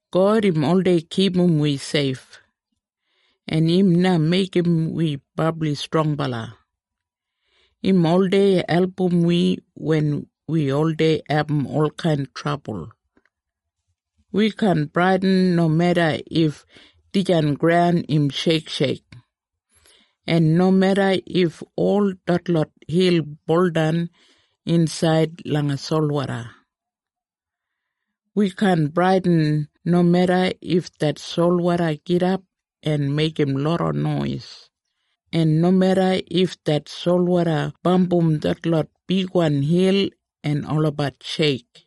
God im oldei kipum wi seif, en im na meigim wi brabli strongbala. Im oldei album wi wen wi oldei abum olkain trabul. Wi kaan bradin nomeda if dijan graun im sheiksheik, en nomeda if ol detlot hil buldan insaid langa solwoda. Wi kaan bradin nomeda if det solwoda gidap en meigim loda nois, en nomeda if det solwoda bambum detlot bigwan hil en olabat sheik.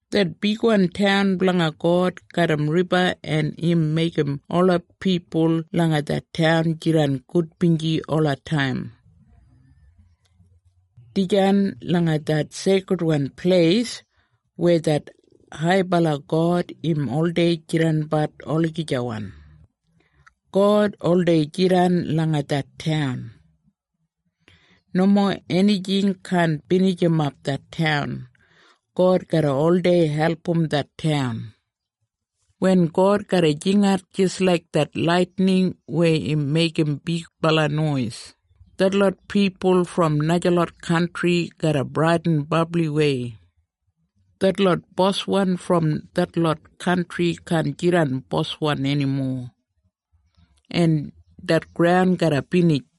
Det bigwan taun blanga God garram riba en im meigim ola pipul langa det taun jidan gudbinji olataim. Dijan langa det seikridwan pleis weya det haibala God im oldei jidanbat olagijawan. God oldei jidan langa det taun. Nomo enijing kaan binijimap det taun. God garra oldei album det taun. Wen God garra jingat jis laik det laitining weya im meigim bigbala nois, detlot pipul brom najalot kantri garra bradin brabliwei. Detlot boswan brom detlot kantri kaan jidan boswan enimo. En det graun garra binij.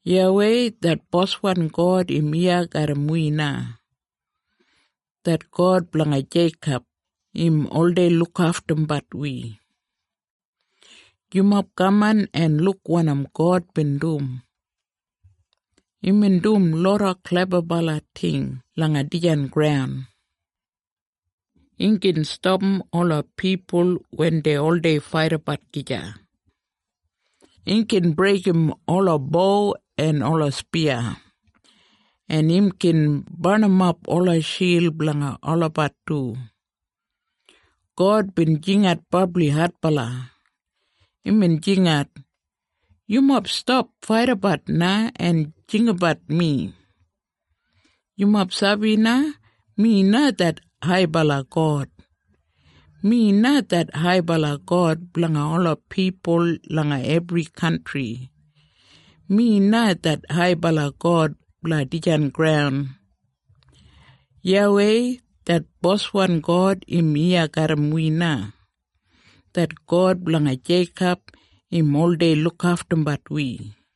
YAWEI det boswan God im iya garram wi na. Det God blanga Jeikob, im oldei lukaftumbat wi. Yumob kaman en luk wanim God bin dum. Imbin dum loda klebabala ting langa dijan graun. Im gin stapam ola pipul wen dei oldei faidabat gija. Im gin breigim ola bo en ola spiya, en im gin barnimap ola shild blanga olabat du. God bin jingat brabli adbala. Imbin jingat, “Yumob stap faidabat na en jinggabat mi! Yumob sabi na, mi na det haibala God. Mi na det haibala God blanga ola pipul langa ebri kantri. Mi na det haibala God blanga dijan graun.” YAWEI det boswan God im iya garram wi na. Det God blanga Jeikob, im oldei lukaftumbat wi.